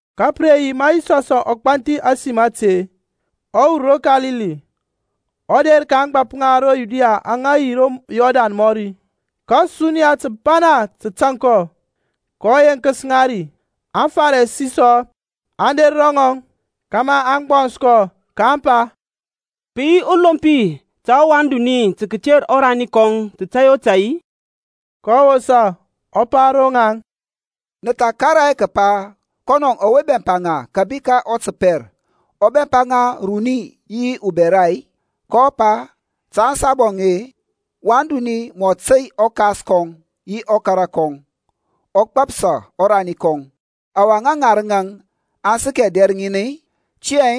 Ka pǝ re yi ma Yisɔsȧŋ ɔ gbanthi ȧsim ȧte-e, ɔ wur ro Kalili, ɔ der ka ȧŋgbȧp ŋa ro Yudia aŋa yi ro Yɔrdan mɔri. Ka suniya tǝbana tǝ tȧŋ kɔ, kɔ yeŋkǝs ŋa ri. AŋFarisi sɔ aŋ der ro ŋɔŋ, kȧmȧ aŋ gbɔns kɔ, kaŋ pa, Pǝ yi ɔlompi ta wan duni tǝ kǝter ɔrani kɔŋ ta tȧy o tai-i? kɔ wosa ɔ pa ro ŋaŋ, Nǝ tha karaŋ hɛ kǝpa kɔnɔ ɔwe bɛmpa ŋa kǝbi ka ɔtǝpɛr ɔ bɛmpa ŋa uruni dɛ yi ubɛra-i? kɔ pa, Ta ȧŋsabu aŋe wan duni mǝ ɔ tey ɔkas kɔŋ yi ɔkara kɔŋ, ɔ gbapsa ɔrani kɔŋ; ɔwa ŋa ŋarǝŋȧŋ aŋ sǝkɛ adɛr ŋin-i? Tiyȧŋ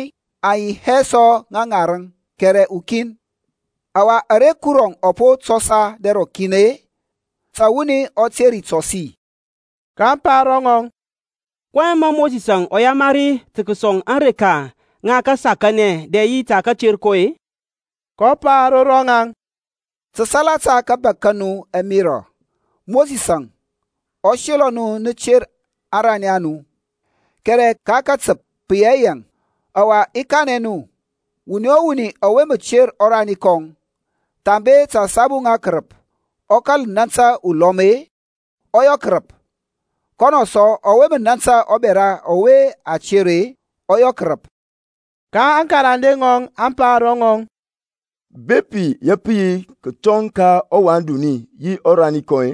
aŋ yi hɛ sɔ ŋarǝŋ kɛrɛ ukin. Ɔwa ȧrȧ Kuru ɔ po tɔsa der ɔkin-e, tȧ wuni ɔ te ri tɔsi. kaŋ pa ro ŋɔŋ, kɔyɛŋ mǝn Mosis ɔ yamari tǝ kǝsɔŋ areka ŋa kǝsakanɛ dɛ yi tǝ kǝter kɔ-e? kɔ pa ro rɔŋaŋ, Ta salata kabak ka nu ɛmerȧ Mosis ɔ selɔ nu tǝ kǝter aŋrani a nu, kɛrɛ ka katǝp pǝ yi hɛ yaŋ. Ɔwa i kanɛ nu, wuni o wuni ɔwe mǝ ter ɔrani kɔŋ, thambe ta ȧŋsabu ŋa kǝrǝp, ɔ kȧl nȧntȧ ulɔm-e, ɔ yɔ kǝrǝp. Kɔnɔ sɔ ɔwe mǝ nȧntȧ ɔbɛra ɔwe a ter-e, ɔ yɔ kǝrǝp. Ka aŋkarande ŋɔŋ aŋ pa ro ŋɔŋ, Bepi ya pǝ yi kǝtɔŋ ka ɔwan duni yi ɔrani kɔŋ-e,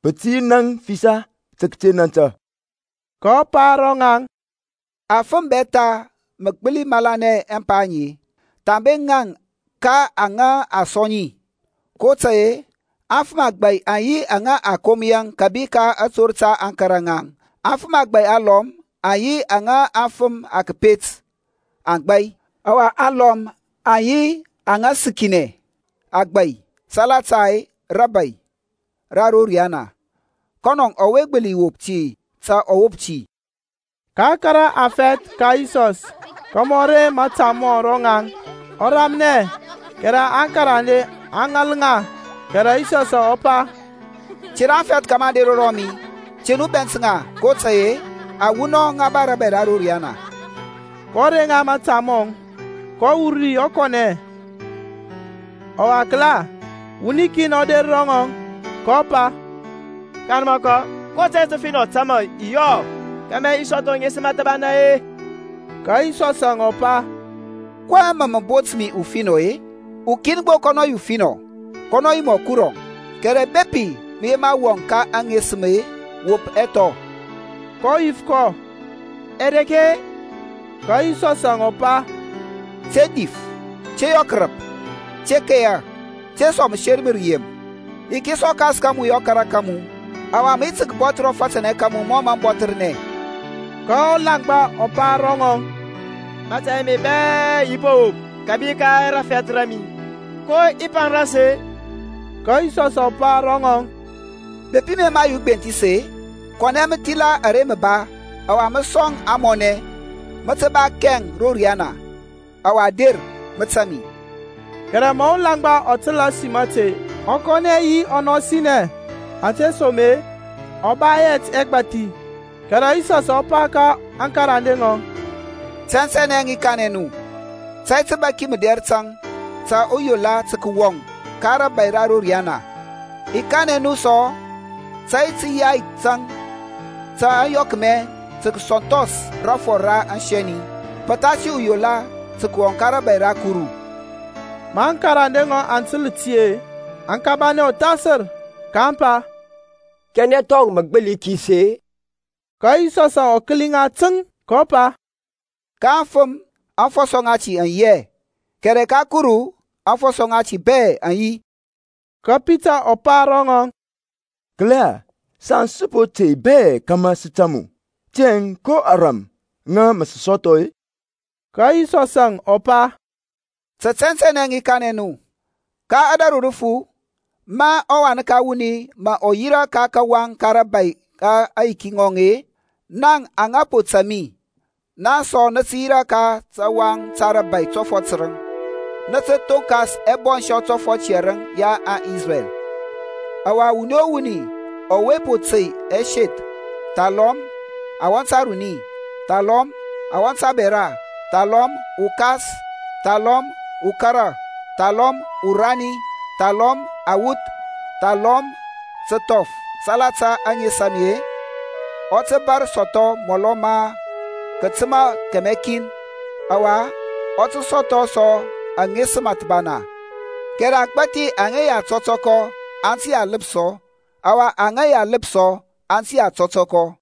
pǝ tǝ yi naŋ fisa tǝ kǝte nȧntȧ. kɔ pa ro ŋaŋ, Afǝm bɛ tha mǝ gbǝli malanɛ ȧŋpa aŋe, thambe ŋaŋ ka aŋa a sɔŋ ŋi. kotȧy-e afǝm agbȧy aŋ yi aŋa a kom yaŋ kǝbi ka ator ta aŋkara ŋaŋ; afǝm agbȧy alɔm aŋ yi aŋa afǝm a kǝpet aŋ gbai; ɔwa alɔm aŋ yi aŋa sǝkinɛ agbȧy salata rȧbȧy ra ro riyana. Kɔnɔ ɔwe gbǝli wop ti ta ɔ wop ti. Ka a kȧrȧ afɛth ka Yisɔs kȧmȧ ɔ reŋ mȧta mɔŋ ro ŋaŋ, ɔ ramnɛ; kɛrɛ aŋkarande aŋ ŋal ŋa. Kɛrɛ Yisɔsȧŋ ɔ pa, Ter aŋfɛth kȧmȧ aŋ der ro mi, te nu bɛnt ŋa, kotȧy-e, awunɔŋ ŋa ba rȧbȧy ra ro riyana. kɔ reŋ ŋa mȧta mɔŋ, kɔ wur ri ɔ kɔnɛ. Ɔwa kǝla, wuni kin ɔ der ro ŋɔŋ, kɔ pa, Karmɔkɔ, ko tȧy tǝfinɔ tǝ mǝ i yɔ kȧmȧ i sɔthɔ aŋesǝm thǝbana-e? Ka Yisɔsȧŋ ɔ pa, kɔyɛŋ mǝ mǝ bont mi ufinɔ-e? Ukin gbo kɔnɔ yi ufinɔ, kɔnɔ yi mɔ Kuruȧŋ. Kɛrɛ bepi mǝ yema wɔŋ ka aŋesǝm, wop ɛthɔ. kɔ yif kɔ, Ɛreke-e? Ka Yisɔsȧŋ ɔ pa, Te dif, te yɔ kǝrǝp, te keya, te sɔŋ mǝseri ma rǝyem. Yikis ɔkas ka mu yi ɔkara ka mu, ɔwa mǝ yi tǝ kǝbɔthǝr ɔfatanɛ ka mu mɔ mǝ bɔthǝrnɛ. Ka ɔlaŋgba ɔ pa ro ŋɔŋ, Mȧtȧy ame bɛ i po wop kǝbi ka rafɛth ra mi. Ko i paŋ ras-e? Ka Yisɔsȧŋ ɔ pa ro ŋɔŋ, Bepi mǝ yema yi ugbenthis-e, kɔnɛ mǝ thila ara mǝ ba, ɔwa mǝ sɔŋ ȧŋmɔnɛ. Mǝ tǝ ba kɛŋ ro riyana, ɔwa der, mǝ tȧŋ mi. Kɛrɛ ma ɔlaŋgba ɔ tǝl ȧsim ȧte ɔ kɔnɛ yi ɔnɔsinɛ, ȧtesoma-e ɔ ba yɛt ɛgbathi. Ka Yisɔs ɔ pa ka aŋkarande ŋɔŋ, Tɛntɛnɛ i kanɛ nu, tȧy tǝbaki mǝdɛr tȧŋ ta uyola tǝ kǝwɔŋ ka rȧbȧy ra ro riyana. I kanɛ nu sɔ, tȧy tǝyai tȧŋ ta ȧyɔkmɛ tǝ kǝsɔnthɔs rafɔr ra ȧŋsɛni, pǝthasi uyola tǝ kǝwɔŋ ka rȧbȧy ra Kuru. Ma aŋkarande ŋɔŋ aŋ tǝl ti-e, aŋ kabanɛ ɔthasǝr, kaŋ pa, Kanɛ thɔŋ mǝ gbǝli kisi-e? Ka Yisɔsȧŋ ɔ kǝli ŋa tǝŋ, kɔ pa, Ka afǝm aŋfɔsɔ ŋati aŋ yi hɛ, kɛrɛ ka Kuru aŋfɔsɔ ŋati bɛ aŋ yi. Ka Pitarȧŋ ɔ pa ro ŋɔŋ, Kǝla, saŋ sǝ po tey bɛ kȧmȧ sǝ tȧŋ mu; tiyȧŋ ko ȧrȧm ŋaŋ mǝ sǝ sɔthɔ-e? Ka Yisɔsȧŋ ɔ pa, Tǝ tɛntɛnɛ i kanɛ nu-e, ka ȧdȧru rǝfu ma ɔWan ka wuni mǝ ɔ yirȧ ka kawaŋ ka rȧbȧy ka aŋyiki ŋɔŋ-e, naŋ aŋa po tȧŋ mi, naŋ sɔ nǝ tǝ yirȧ ka tǝwaŋ ta rȧbȧy tɔfɔt tǝrǝŋ, nǝ tǝ thonkas ɛbɔnsɔŋ tɔfɔt yɛrǝŋ ya aŋIsrɛl, Ɔwa wuni o wuni ɔwe po tey ɛseth, thalɔm awɔnt aruni, thalɔm awɔnt abɛra, thalɔm ukas, thalɔm ukara, thalɔm urani, thalɔm awuth, thalɔm tǝthɔf salata ȧŋes a mi-e, ɔ tǝ bȧr sɔthɔ mɔlɔ ma kǝtǝma kɛmɛ kin, ɔwa ɔ tǝ sɔthɔ sɔ aŋesǝm thǝbana. Kɛrɛ agbȧthi aŋa yi ȧtɔtɔkɔ aŋ tǝ yi alǝpsɔ. Ɔwa aŋa yi alǝpsɔ aŋ tǝ yi ȧtɔtɔkɔ.